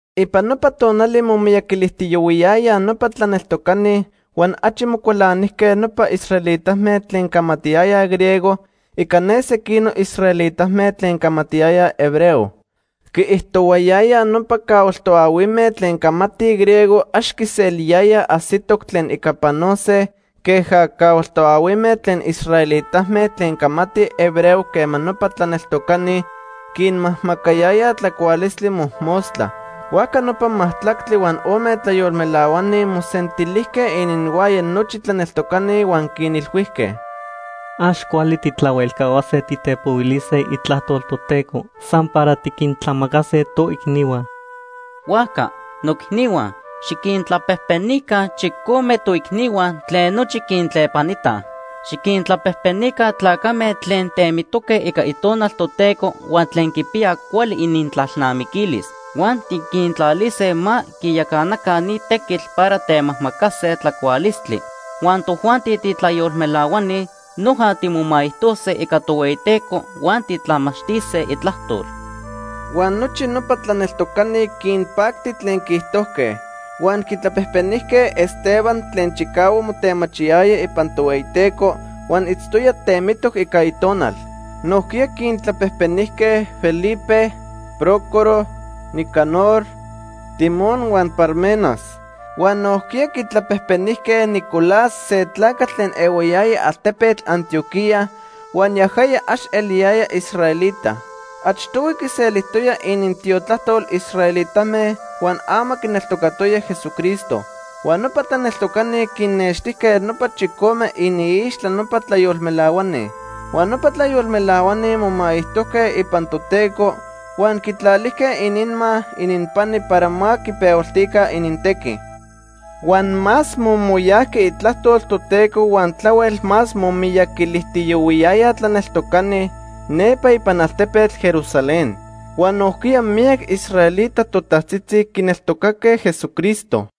Ipan nopa tonali momiyaquilijtiyohuiyayaj nopa tlaneltocani huan achi mocualanijque nopa israelitame tlen camatiyayaj griego ica ne sequinoc israelitame tlen camatiyayaj hebreo. Quiijtohuayayaj nopa cahual toahuime tlen camatij griego ax quiseliyayaj ajsitoc tlen ica panose queja cahual toahuime tlen israelitame tlen camatij hebreo quema nopa tlaneltocani quinmajmacayayaj tlacualistli mojmostla. Huajca nopa majtlactli huan ome tlayolmelahuani mosentilijque ininhuaya nochi tlaneltocani huan quinilhuijque: ―Ax cuali tijtlahuelcahuase titepohuilise Itlajtol Toteco san para tiquintlamacase toicnihua. Huajca, noicnihua, xiquintlapejpenica chicome toicnihua tlen nochi quintlepanitaj. Xiquintlapejpenica tlacame tlen temitoque ica Itonal Toteco huan tlen quipiyaj cuali inintlalnamiquilis. Huan tiquintlalise ma quiyacanaca ni tequitl para temajmacase tlacualistli. Huan tojuanti titlayolmelahuani, noja timomaijtose ica Tohueyiteco huan titlamachtise Itlajtol. Huan nochi nopa tlaneltocani quinpacti tlen quiijtojque. Huan quitlapejpenijque Esteban tlen chicahuac motemachiyaya ipan Tohueyiteco huan itztoya temitoc ica Itonal. Nojquiya quintlapejpenijque Felipe, Prócoro, Nicanor, Timón huan Parmenas. Huan nojquiya quitlapejpenijque Nicolás se tlacatl tlen ehuayaya altepetl Antioquía huan yajaya ax eliyaya israelita. Achtohui quiselijtoya inintiotlajtol israelitame huan ama quineltocatoya Jesucristo. Huan nopa tlaneltocani quinnextijque nopa chicome iniixtla nopa tlayolmelahuani. Huan nopa tlayolmelahuani momaijtojque ipan Toteco huan quitlalijque ininma ininpani para ma quipehualtica inintequi. Huan más momoyajqui itlajtol Toteco huan tlahuel más momiyaquilijtiyohuiyayaj tlaneltocani nepa ipan altepetl Jerusalén. Huan nojquiya miyac israelita totajtzitzi quineltocaque Jesucristo.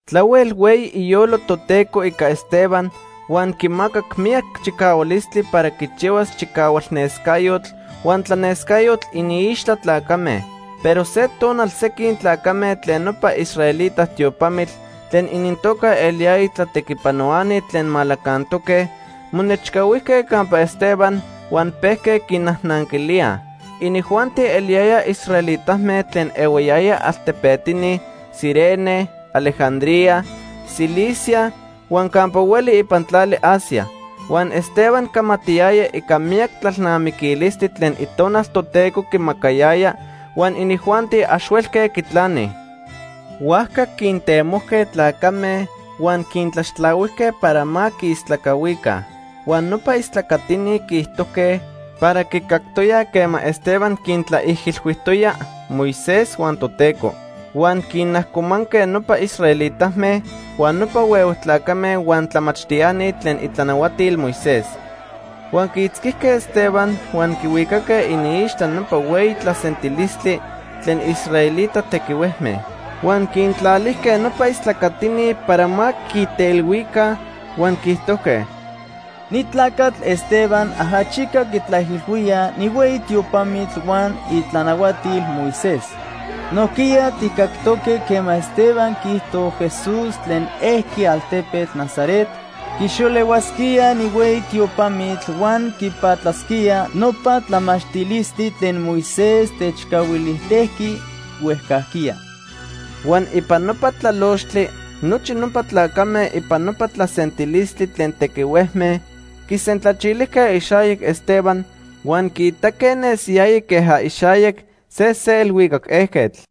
Tlahuel hueyi iyolo Toteco ica Esteban huan quimacac miyac chicahualistli para quichihuas chicahualnescayotl huan tlanescayotl iniixtla tlacame. Pero se tonal sequin tlacame tlen nopa israelita tiopamitl tlen inintoca eliyaya Tlatequipanohuani Tlen Malacantoque monechcahuijque campa Esteban huan pejque quinajnanquilíaj. Inijuanti eliyayaj israelitame tlen ehuayayaj altepetini Cirene, Alejandría, Cilicia huan campa hueli ipan tlali Asia. Huan Esteban camatiyaya ica miyac tlalnamiquilistli tlen Itonal Toteco quimacayaya huan inijuanti ax huelque quitlanij. Huajca quintemojque tlacame huan quintlaxtlahuijque para ma quiistlacahuica. Huan nopa istlacatini quiijtojque para quicactoyaj quema Esteban quintlaijilhuijtoya Moisés huan Toteco. Huan quinajcomanque nopa israelitame, huan nopa huehue tlacame huan tlamachtiani tlen itlanahuatil Moisés. Huan quiitzquijque Esteban huan quihuicaque iniixtla nopa hueyi tlasentilistli tlen israelita tequihuejme. Huan quintlalijque nopa istlacatini para ma quiteilhuica huan quiijtojque: ―Ni tlacatl Esteban ajachica quitlaijilhuía ni hueyi tiopamitl huan itlanahuatil Moisés. Nojquiya tijcactoque quema Esteban quiijto Jesús tlen ejqui altepetl Nazaret quixolehuasquía ni hueyi tiopamitl huan quipatlasquía nopa tlamachtilistli tlen Moisés techcahuilijtejqui huejcajquiya. Huan ipan nopa tlalochtli nochi nopa tlacame ipan nopa tlasentilistli tlen tequihuejme quisentlachilijque ixayac Esteban, huan quiitaque nesiyaya queja ixayac se se elhuicac ejquetl.